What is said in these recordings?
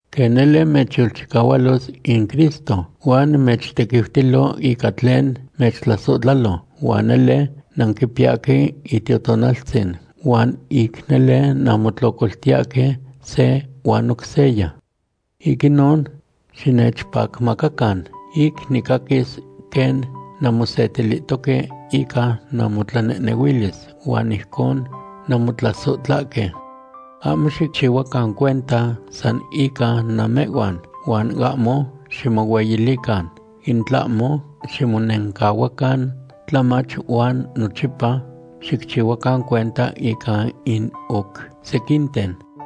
Quen nele mechyolchicahualos in Cristo huan mechtequiutilo ica tlen mechtlasohtlalo, huan nele nanquipiyahque Itiotonaltzin huan ic nele nanmotlocoltiyahque se huan oc seya. Ic inon, xinechpacmacacan ic nicaquis quen nanmosetilihtoque ica namotlanehnehuilis huan ijcon nanmotlasohtlahque. Ahmo xicchihuacan cuenta san ican namehhuan huan ahmo ximohueyilican, in tlahmo ximonencahuacan tlamach huan nochipa xicchihuacan cuenta ica in oc sequinten.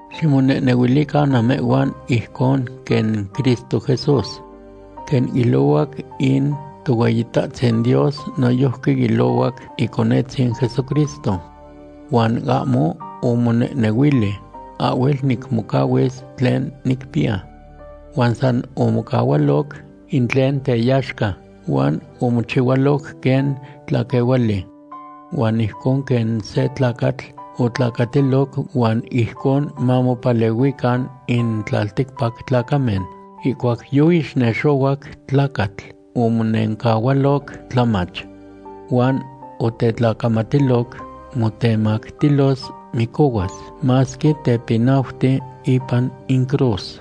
Ximonehnehuilican namehhuan ijcon quen Cristo Jesús. Quen ilohuac in Tohueyitahtzin Dios noyojqui ilohuac Iconetzin Jesucristo. Huan ahmo omonehnehuili: “Ahhuel nicmocahuis tlen nicpiya.” Huan san omocahualoc in tlen teyaxca huan omochihualoc quen tlaquehuali. Huan ijcon quen se tlacatl otlacatiloc huan ijcon mamopalehuican in tlalticpac tlacamen. Ihcuac yoixnexohuac tlacatl, omonencahualoc tlamach. Huan otetlacamatiloc motemactilos micohuas, masque tepinauti ipan in cruz.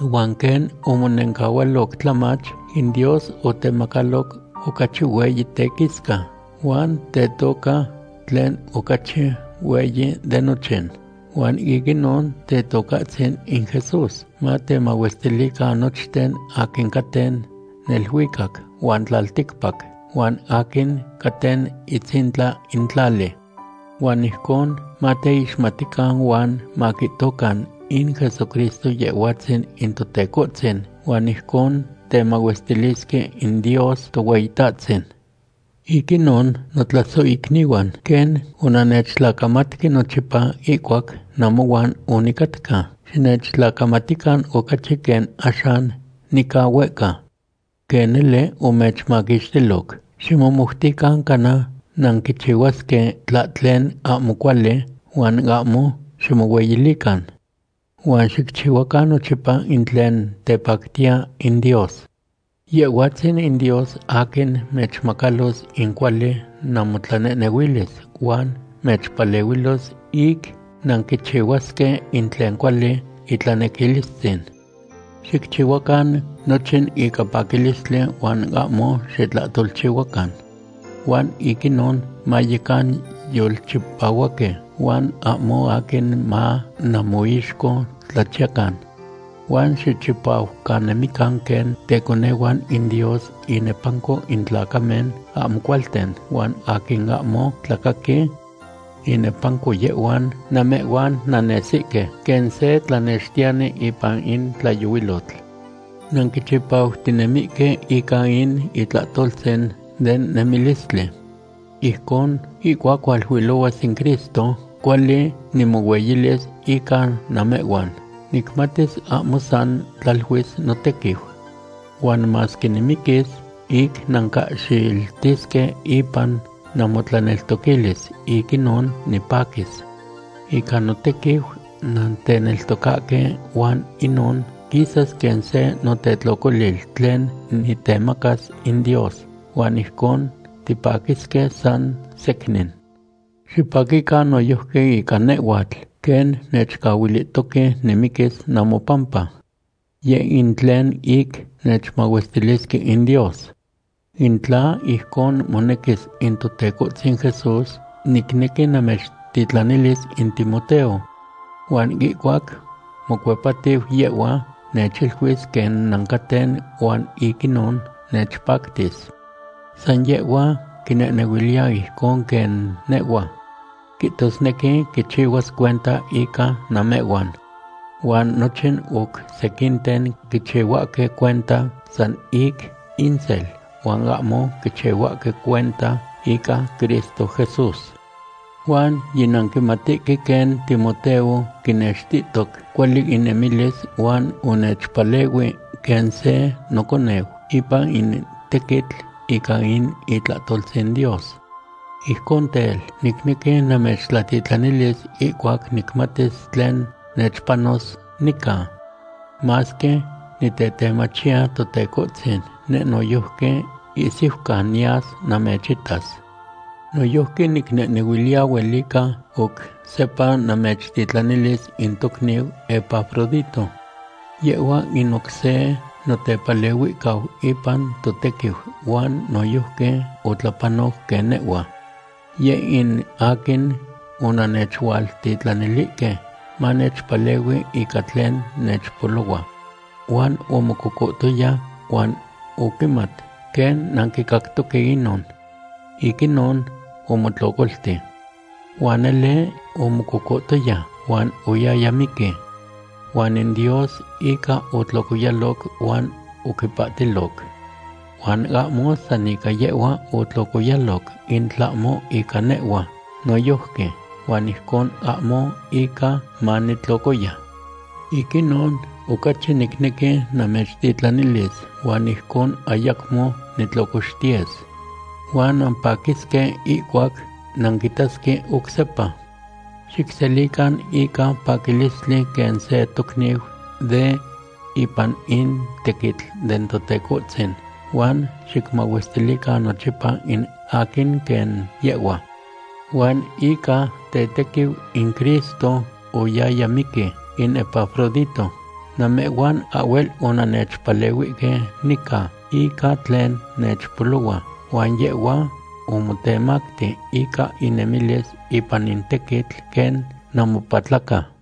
Huan quen omonencahualoc tlamach, in Dios otemacaloc ocachi hueyi tequisca, huan tetoca tlen ocachi hueyi de nochin. Huan ic inon Tetocahtzin in Jesús matemahuestilican nochten aquin caten neluicac huan tlalticpac, huan aquin caten itzintla in tlali. Huan ijcon mateixmatican huan maquihtocan in Jesucristo Yehhuatzin in Totecohtzin huan ijcon temahuestilisque in Dios Tohueyitahtzin. Ic inon, notlasohicnihuan, quen onannechtlacamatque nochipa ihcuac namohuan onicatca, xinechtlacamatican ocachi quen axan nica huehca. Quen nele omechmaquixtiloc, ximomoutican cana nanquichihuasque tlahtlen ahmo cuali, huan ahmo ximohueyilican. Huan xicchihuacan nochipa in tlen tepactiya in Dios. Yehhuatzin in Dios aquin mechmacalos in cuali namotlanehnehuilis huan mechpalehuilos ic nanquichihuasque in tlen cuali itlanequilistzin. Xicchihuacan nochin ica paquilistli huan ahmo xitlahtolchihuacan. Huan ic inon mayecan yolchipahuaque huan ahmo aquin ma namoixco tlachiyacan. Huan xichipajcanemican quen teconehuan in Dios inepanco in tlacamen ahmo cualten huan aquin ahmo tlacaqui. Inepanco yehhuan namehhuan nannesihque quen se tlanextiyani ipan in tlayohuilotl. Nanquichipautinemihque ica in itlahtoltzin den nemilistli. Ijcon, ihcuac hualuilohuas in Cristo, cuali nimohueyilis ica namehhuan. Nicmatis ahmo san tlaluis notequiu. Huan masque nimiquis ic nancahxiltisque ipan namotlaneltoquilis, ic inon nipaquis. Ica notequiu nanteneltocahque huan inon quisas quen se notetlocolil tlen nitemacas in Dios, huan ijcon tipaquisque san secnin. Xipaquican noyojqui ica nehhuatl quen nechcahuilihtoque nimiquis namopampa. Yeh in tlen ic nechmahuestilisque in Dios. In tla ijcon monequis in Totecohtzin Jesús, nicnequi namechtitlanilis in Timoteo. Huan ihcuac mocuepatiu yehhua, nechiluis quen nancaten huan ic inon nechpactis. San yehhua quinehnehuiliya ijcon quen nehhua. Quihtosnequi quichihuas cuenta ica namehhuan. Huan nochin oc sequinten quichihuahque cuenta san ic insel huan ahmo quichihuahque cuenta ica Cristo Jesús. Huan yinanquimatihque quen Timoteo quinextihtoc cuali inemilis huan onechpalehui quen se noconeu ipan in tequitl ica in itlahtoltzin Dios. Ijcon tel, nicnequi namechtlatitlanilis ihcuac nicmatis tlen nechpanos nica. Masque nitetemachiya Totecohtzin, neh noyojqui ihsiucan niyas namechitas. Noyojqui nicnehnehuiliya huelica oc sepa namechtitlanilis in tocniu Epafrodito. Yehhua in oc se notepalehuihcau ipan totequiu huan noyojqui otlapanoc quen nehhua. Yeh in aquin onannechualtitlanilihque manechpalehui ica tlen nechpolohua. Huan omococohtoya huan oquimat quen nanquicactoque inon. Ic inon omotlocolti. Huan nele omococohtoya, huan oyaya miqui. Huan in Dios ica otlocoyaloc huan oquipahtiloc. Huan ahmo san ica yehhua otlocoyaloc, in tlahmo ica nehhua noyojqui, huan ijcon ahmo ica manitlocoya. Ic inon, ocachi nicnequi namechtitlanilis huan ijcon ayacmo nitlocoxtiyes. Huan nampaquisque ihcuac nanquitasque oc sepa. Xicselican ica paquilistli quen se tocniu de ipan in tequitl den Totecohtzin, huan xicmahuestilican nochipa in aquin quen yehhua. Huan ica tetequiu in Cristo oyaya miqui in Epafrodito. Namehhuan ahhuel onannechpalehuihque nica ica tlen nechpolohua, huan yehhua omotemacti ica inemilis ipan in tequitl quen namopatlaca.